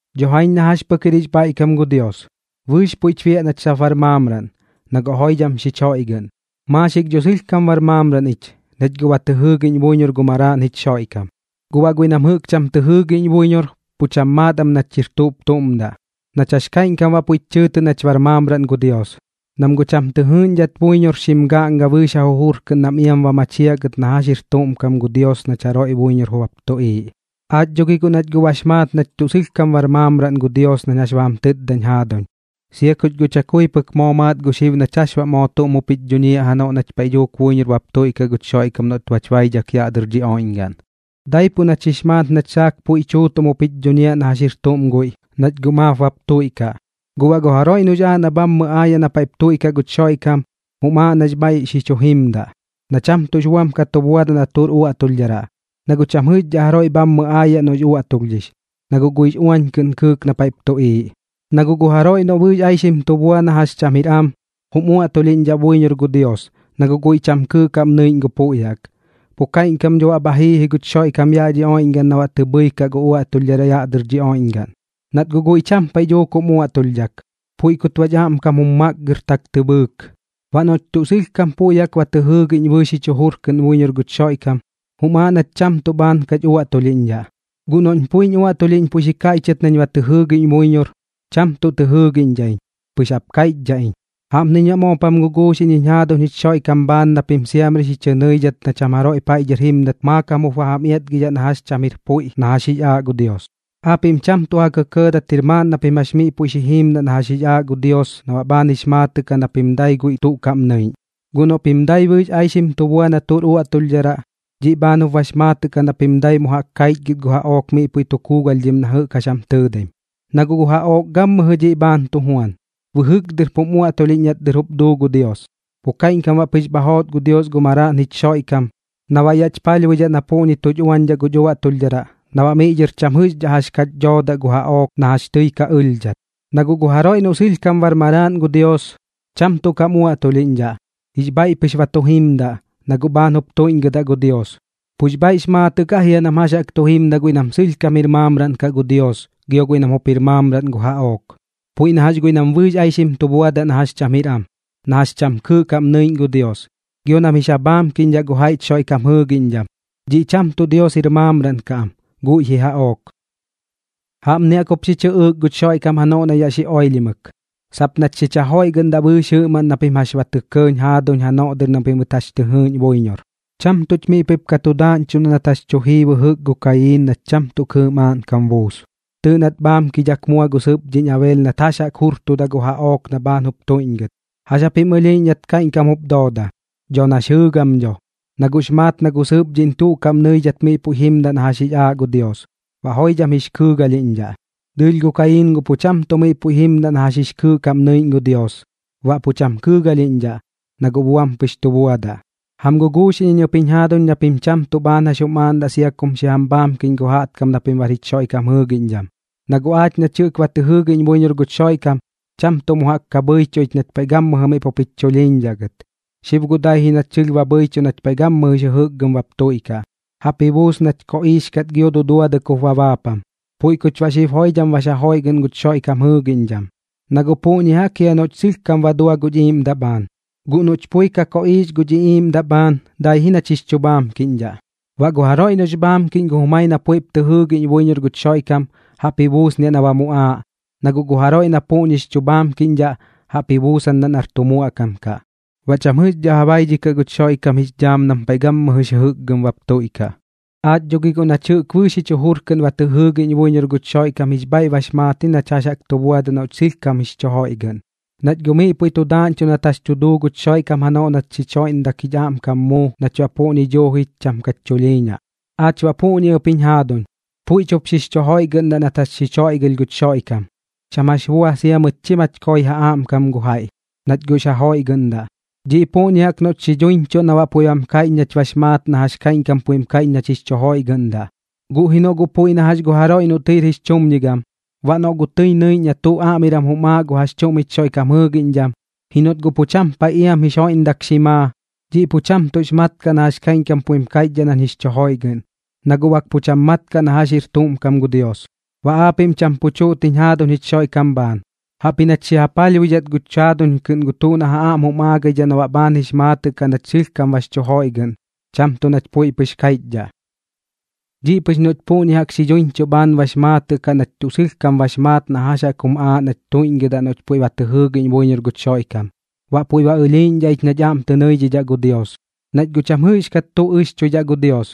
Dho jaiñ na jax pɨk jir jix bhaiꞌkam gu Dios, bɨɨx puiꞌch biaꞌ nach sap bar maamraꞌn, na guꞌ joidham xich joiꞌgɨꞌn. Maaxik dho sɨlhkam bar maamraꞌn ich, nach guꞌ ba tɨ jɨɨgiꞌñ buiñor gu Maraaꞌn jich Xoiꞌkam. Guꞌ baꞌ guiꞌ nam jɨꞌk cham tɨ jɨɨgiꞌñ buiñor, pu cham maat am nach jir tuꞌp tuꞌm daꞌ, nach jax kaiꞌñkam baꞌ puiꞌ bach chɨɨtɨꞌ nach bar maamraꞌn gu Dios, nam guꞌ cham tɨ jɨɨꞌñdhat buiñor xim gaꞌnga bɨɨx ja jujur kɨꞌn nam iam ba machiaꞌ gɨt na jax jir tuꞌm kam gu Dios nach jaroiꞌ buiñor bap tuꞌiiꞌ. Aach dho gi nach guꞌ bax maat nach tuꞌ sɨlhkam bar maamraꞌn gu Dios nañ jax ba jam tɨtdañ jaaduñ, sia kuch guꞌ chakui pɨk moo maat gu xib nach jax moo tuꞌm jup jich dhuñiaꞌ janoꞌ nach paiꞌ dhuuk buiñor bap tuiꞌkaꞌ guch Xoiꞌkam noꞌt bach baidhak yaꞌ dɨr dhi oiꞌñgaꞌn. Daipuꞌ nach jix maat nach saak puiꞌ tuutuꞌm jup jich dhuñiaꞌ na jax jir tuꞌm guiꞌ, nach guꞌ maap bap tuiꞌkaꞌ. Guꞌ baꞌ gu jaroiꞌ noꞌx aaꞌ na bhammɨ aayaꞌ na paiꞌp tuiꞌkaꞌ guch Xoiꞌkam, jum aaꞌ nax bhaiꞌ xi chu jimdaꞌ, na cham tuꞌx buam ka tu buadaꞌ na tuꞌr uaꞌtulhdharaꞌ. Na guꞌ cham jɨꞌxdhaꞌ jaroiꞌ bhammɨ aayaꞌ noꞌx uaꞌtulhdhix, na guꞌ guiꞌx uañ kɨꞌn kɨɨk na paiꞌp tuꞌiiꞌ. Na guꞌ gu jaroiꞌ noꞌ bɨɨx aixim tu bua na jax cham jir am, jum uaꞌtulhiꞌñdhaꞌ buiñor gu Dios, na guꞌ guiꞌ cham kɨɨꞌ kaꞌm nɨiꞌñ gu puiꞌ jaꞌk. Pu kaiꞌñkam dho bha jii guch Xoiꞌkam yaꞌ dhi oiꞌñgaꞌn na baꞌ tɨ bhɨikaꞌ gu uaꞌtulhdharaꞌ yaꞌ dɨr dhi oiꞌñgaꞌn. Nat guꞌ guiꞌ cham paiꞌ dhuuk jum uaꞌtulhdhak, puiꞌ kut baꞌch aꞌmkam jum makgɨrtak tɨ bhɨɨk. Baꞌ noꞌch tuꞌ sɨlhkam puiꞌ jaꞌk ba tɨ jɨɨgiꞌñ bɨɨx jich jur kɨꞌn buiñor guch Xoiꞌkam, jum aaꞌ nach cham tuꞌ bhaan kach uaꞌtulhiꞌñdhaꞌ. Guꞌ noꞌñ guꞌ puiñ uaꞌtulhiꞌñ puiꞌ xi kaiꞌchɨt nañ ba tɨ jɨɨgiꞌñ buiñor, cham tuꞌ tɨ jɨɨgiꞌñdhaꞌ iñ, pɨx jap kaiꞌchdhaꞌ iñ. Jaꞌpniñ baꞌ moop jam guguuxiꞌñ jiñ jaaduñ jich Xoiꞌkam bhaan na pim siamri xi chɨ nɨidhat na cham jaroiꞌ paiꞌ dhɨr jimdat maakam jup ba jam iatgidhaꞌ na jax cham jir puiꞌ na jax jix aaꞌ gu Dios. Aapiꞌm cham tuꞌ ji kɇkɇɇdat jir maaꞌn na pim jax miꞌ puiꞌ xi jiimdaꞌ na jax jix aaꞌ gu Dios na baꞌ bhaan jix maatɨꞌ kaꞌ na pim dai guiꞌ tuꞌ kaꞌm nɨiꞌñ. Guꞌ noꞌ pim guꞌ dai bɨɨx aixim tu bua na tuꞌr uaꞌtulhdharaꞌ, dhiꞌ bhaan jup bax maatɨꞌ kaꞌ na pim dai mu jaꞌk kaichgɨt gu jaꞌook miꞌ puiꞌ tu kuugalhdhim na jɨꞌk jax jam tɨɨdaim. Na guꞌ gu jaꞌook gammɨjɨ dhiꞌ bhaan tu juan, bɨjɨk dɨr pum uaꞌtulhiꞌñ nat dɨr jup duu gu Dios. Pu kaiꞌñkam baꞌ pɨx bha joot gu Dios gu Maraaꞌn jich Xoiꞌkam na baꞌ yaꞌch palhbuidhaꞌ na puꞌñi tuch uañdhaꞌ guch uaꞌtulhdharaꞌ, na baꞌ miꞌ dhɨr cham jɨꞌxdhaꞌ jax kach dhoodaꞌ gu jaꞌook na jax tɨi ka ɨlhdhat. Na guꞌ gu jaroiꞌ noꞌ sɨlhkam bar maraaꞌn gu Dios, cham tuꞌ kam uaꞌtulhiꞌñdhaꞌ. Jix bhaiꞌ pɨx ba tu jimdaꞌ, na guꞌ bhaan jup tuiꞌñgɨdaꞌ gu Dios. Pux bhaiꞌx maatɨꞌ kaꞌ jia nam jax jaꞌk tu jimdaꞌ guiꞌ nam sɨlhkam jir maamraꞌn kaꞌ gu Dios gio guiꞌ nam jup jir maamraꞌn gu jaꞌook. Puiꞌ na jax guiꞌ nam bɨɨx aixim tu buadaꞌ na jax cham jir am, na jax cham kɨɨꞌ kaꞌm nɨiꞌñ gu Dios, gio nam jix ja bhaamkiꞌñdhaꞌ gu jaiꞌch Xoiꞌkam jɨɨgiꞌñdham, dhiꞌ cham tuꞌ Dios jir maamraꞌn kaꞌ am, guiꞌ ji jaꞌook. Jaꞌpni jaꞌk jup xi chɨꞌɨɨk guch Xoiꞌkam janoꞌ na yaꞌ xi oilhimɨk, sap nach xich jajoiꞌgɨꞌndaꞌ bɨɨx jɨꞌmaꞌn na pim jax ba tɇ kɇɇñ jaaduñ janoꞌ dɨr na pimɨt jax tɨ jɨɨꞌñ buiñor. Cham tuꞌch miꞌ puiꞌp ka tu daaꞌñchuꞌn nat jax tu jii bɨjɨk gu Kayiin nat cham tuꞌ kɨɨꞌ maaꞌnkam buus. Tɨɨꞌ nat bhaamkidhak mua gu sɨpdhiꞌñ Abeel nat jax jaꞌk jurtuda gu jaꞌook na bhaan jup tuiꞌñgɨt. ¿Jax japim ɨlhiiꞌñ nat kaiꞌñkam jup doodaꞌ? Dho nax jɨɨgam dho, na guꞌx maat na gu sɨpdhiꞌñ tuꞌ kaꞌm nɨidhat miꞌ puiꞌ jimdaꞌ na jax jix aaꞌ gu Dios, baꞌ joidham jix kɨɨgalhiꞌñdhaꞌ. Dɨɨlh guꞌ gu Kayiin pu cham tuꞌ miꞌ puiꞌ jimdaꞌ na jax jaꞌk jix kɨɨꞌ kaꞌm nɨiꞌñ gu Dios, baꞌ pu cham kɨɨgalhiꞌñdhaꞌ, na guꞌ buam pɨx tu buadaꞌ. Jam guguuxiꞌñ iñ ɨp jiñ jaaduñ na pim cham tuꞌ bhaan jax jum aaꞌndaꞌ sia kum xi jam bhaamkiꞌñ gu jaꞌtkam na pim bar jich Xoiꞌkam jɨɨgiꞌñdham. Na guꞌ aach nach jɨꞌk ba tɨ jɨɨgiꞌñ buiñor guch Xoiꞌkam, cham tuꞌ mu jaꞌk ka bhɨichuꞌ ich nach paiꞌ gammɨjɨ miꞌ pup jich chulhiiñdhaꞌ gɨt. Xib guꞌ dai ji nach sɨlh ba bhɨichuꞌ nach paiꞌ gammɨjɨx jɨjɨkgɨm bap tuiꞌkaꞌ, jaꞌp ji buus nach koꞌiix kat gio duduadɨk jup ba baapam. Puiꞌ kuch baꞌ xib joidham bax ja joiꞌgɨꞌn guch Xoiꞌkam jɨɨgiꞌñdham, na guꞌ puꞌñi jaꞌk jia noꞌch sɨlhkam ba dua guch iiꞌmdaꞌ bhaan, guꞌ noꞌch pui ka koꞌiix guch iꞌiiꞌmdaꞌ bhaan, dai ji nach jix chu bhaamkiꞌñdhaꞌ. Baꞌ gu jaroiꞌ noꞌx bhaamkiꞌñ gu jumai na puiꞌp tɨ jɨɨgiꞌñ buiñor guch Xoiꞌkam, jaꞌp ji buusniaꞌ na ba muꞌaaꞌ, na guꞌ gu jaroiꞌ na puꞌñix chu bhaamkiꞌñdhaꞌ, jaꞌp ji buusandaꞌ nar tu muaꞌkam kaꞌ, baꞌ cham jɨꞌxdhaꞌ ja baidhikaꞌ guch Xoiꞌkam jix dhaam nam paiꞌ gammɨjɨx jɨkgɨm bap tuiꞌkaꞌ. Aach dho gi guꞌ nach jɨꞌk bɨɨx jich jujur kɨꞌn ba tɨ jɨɨgiꞌñ buiñor guch Xoiꞌkam jix bhaiꞌ bax maat ji nach jax jaꞌk tu buadaꞌ noꞌch sɨlhkam jix chu joiꞌgɨꞌn, nach guꞌ miꞌ puiꞌ tu daaꞌñchuꞌ nat jax tu duu guch Xoiꞌkam janoꞌ nat joidham xich joiꞌndak jich aꞌmkam muu nach baꞌ puꞌñi duuji cham kach chulhiiñaꞌ. Aach baꞌ puꞌñi ɨp jiñ jaaduñ, puiꞌch jup xix chu joiꞌgɨꞌndaꞌ nat jax xich joiꞌgɨlh guch Xoiꞌkam, cham jax bua sia mɨt chi mach koi ja aꞌmkam gu jaiꞌ, nach guꞌx ja joiꞌgɨꞌndaꞌ. Dhiꞌ jɨꞌ puꞌñi jaꞌk noꞌch xi dhuiñchuꞌ na baꞌ puiꞌ bam kaiꞌch nach bax maat na jax kaiꞌñkam puiꞌm kaiꞌch nach jix chu joiꞌgɨꞌndaꞌ. Guꞌ ji noꞌ guꞌ puiꞌ na jax gu jaroiꞌ noꞌ tɨir jix chumñigam, baꞌ noꞌ guꞌ tɨi nɨiꞌñ na tuꞌ aꞌmiram jum aaꞌ gu jax chuꞌm jich Xoiꞌkam jɨɨgiꞌñdham, ji noꞌt guꞌ pu cham paiꞌ iam jix joiꞌndak xi maa, dhiꞌ pu cham tuꞌx mat kaꞌ na jax kaiꞌñkam puiꞌm kaiꞌchdhaꞌ nañ jix chu joiꞌgɨꞌn, na guꞌ bak pu cham mat kaꞌ na jax jir tuꞌm kam gu Dios. Baꞌ aapiꞌm cham pu chuꞌt jiñ jaaduñ jich Xoiꞌkam bhaan, jaꞌpji nach xi ja palhbuidhat guch jaaduñ kɨꞌn gu tuꞌ na ja aꞌm jum aagaidhaꞌ na baꞌ bhaan jix maatɨꞌ kaꞌ nach sɨlhkam bax chu joiꞌgɨꞌn, cham tuꞌ nach puiꞌ pɨx kaiꞌchdhaꞌ. Dhiꞌ pɨx noꞌch puꞌñi jaꞌk xi dhuiñchuꞌ bhaan bax maatɨꞌ kaꞌ nach tuꞌ sɨlhkam bax maat na jax jaꞌk jum aaꞌ nach tuiꞌñgɨdaꞌ noꞌch puiꞌ ba tɨ jɨɨgiꞌñ buiñor guch Xoiꞌkam, baꞌ puiꞌ ba ɨlhiiꞌñdhaꞌ ich nach aꞌm tɨ nɨidhidhaꞌ gu Dios. Nach guꞌ cham jɨꞌxkat tuꞌ ɨxchuidhaꞌ gu Dios,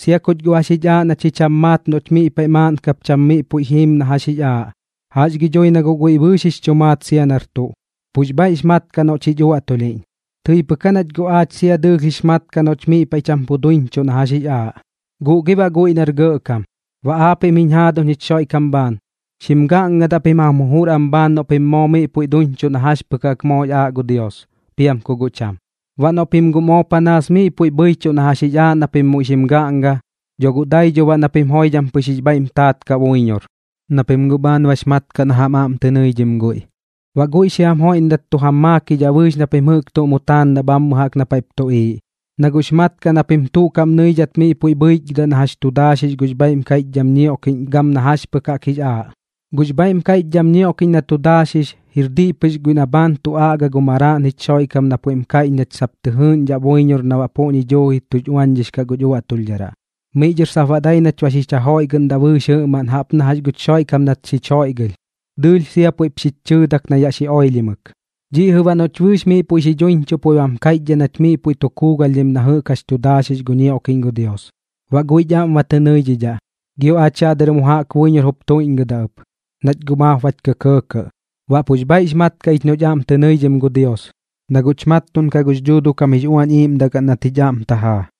sia kuch guꞌ jax jich aaꞌ na chi cham maat noꞌch miꞌ paiꞌ maaꞌn kap cham miꞌ puiꞌ jiim na jax jix aaꞌ. Jax gi dhui na guꞌ guiꞌ bɨɨx jix chu maat sia nar tuꞌ, pux bhaiꞌx mat kaꞌ noꞌch jich uaꞌtulhiꞌñ. Tɨi pɨk aa nach guꞌ aach sia dɨɨlh jix mat kaꞌ noꞌch miꞌ paiꞌ cham pu duiñchuꞌ na jax jix aaꞌ, guꞌ gi baꞌ guiꞌ nar gɇꞌkam. Baꞌ aapiꞌm jiñ jaaduñ jich Xoiꞌkam bhaan, xim gaꞌngadaꞌ pim jam jujur am bhaan noꞌ pim moo miꞌ puiꞌp duiñchuꞌ na jax pɨk jaꞌk moox aaꞌ gu Dios, piam ku guꞌ cham. Baꞌ noꞌ pim guꞌ moo panaas miꞌ puiꞌ bhɨichuꞌ na jax jix aaꞌ na pim muiꞌ xim gaꞌnga, dho guꞌ dai dho baꞌ na pim joidham pɨx jix bhaiꞌm taat kaꞌ buiñor, na pim guꞌ bhaan bax mat kaꞌ na jam aꞌm tɨ nɨidhim guiꞌ. Baꞌ guiꞌ xi jam joiꞌndat tu jam maakidhaꞌ bɨɨx na pim jɨꞌk tuꞌ mu taandaꞌ bhammɨ jaꞌk na paiꞌp tuꞌiiꞌ, na guꞌx mat kaꞌ na pim tuꞌ kaꞌm nɨidhat miꞌ puiꞌ bhɨichgɨdaꞌ na jax chu daaxix gux bhaiꞌm kaiꞌchdham ñioꞌkiꞌñ gam na jax pɨk jaꞌk jix aaꞌ. Gux bhaiꞌm kaiꞌchdham ñioꞌkiꞌñ na tu daaxix, jir diꞌ pɨx guiꞌ na bhaan tu aꞌga gu Maraaꞌn jich Xoiꞌkam na puiꞌm kaiꞌch nach sap tɨ jɨɨꞌñdhaꞌ buiñor na baꞌ puꞌñi duuji uañchudhix kaꞌ guch uaꞌtulhdharaꞌ. Miꞌ dhɨr sap baꞌ dai nach ba xich jajoiꞌgɨꞌndaꞌ bɨɨx jɨꞌmaꞌn jaꞌp na jax guch Xoiꞌkam nat xich joiꞌgɨlh, dɨɨlh sia puiꞌp xich chɨɨdak na yaꞌ xi oilhimɨk. Dhiꞌ jɨꞌ baꞌ noꞌch bɨɨx miꞌ puiꞌ xi dhuiñchuꞌ puiꞌ bam kaiꞌchdhaꞌ nach miꞌ puiꞌ tu kuugalhdhim na jɨꞌk jax chu daaxix gu ñioꞌkiꞌñ gu Dios. Baꞌ guiꞌch aꞌm ba tɨ nɨidhidhaꞌ, gio aach yaꞌ dɨr mu jaꞌk buiñor jup tuiꞌñgɨdaꞌ ɨp, nach guꞌ maap bach kɇkɇɇkɇꞌ. Baꞌ pux bhaiꞌx mat kaꞌ ich noꞌch aꞌm tɨ nɨidhim gu Dios, na guꞌch mattuꞌnkaꞌ gux Dhuuduꞌ kam jix Uañ Iiꞌmdagaꞌn nat jich aꞌm tajaa.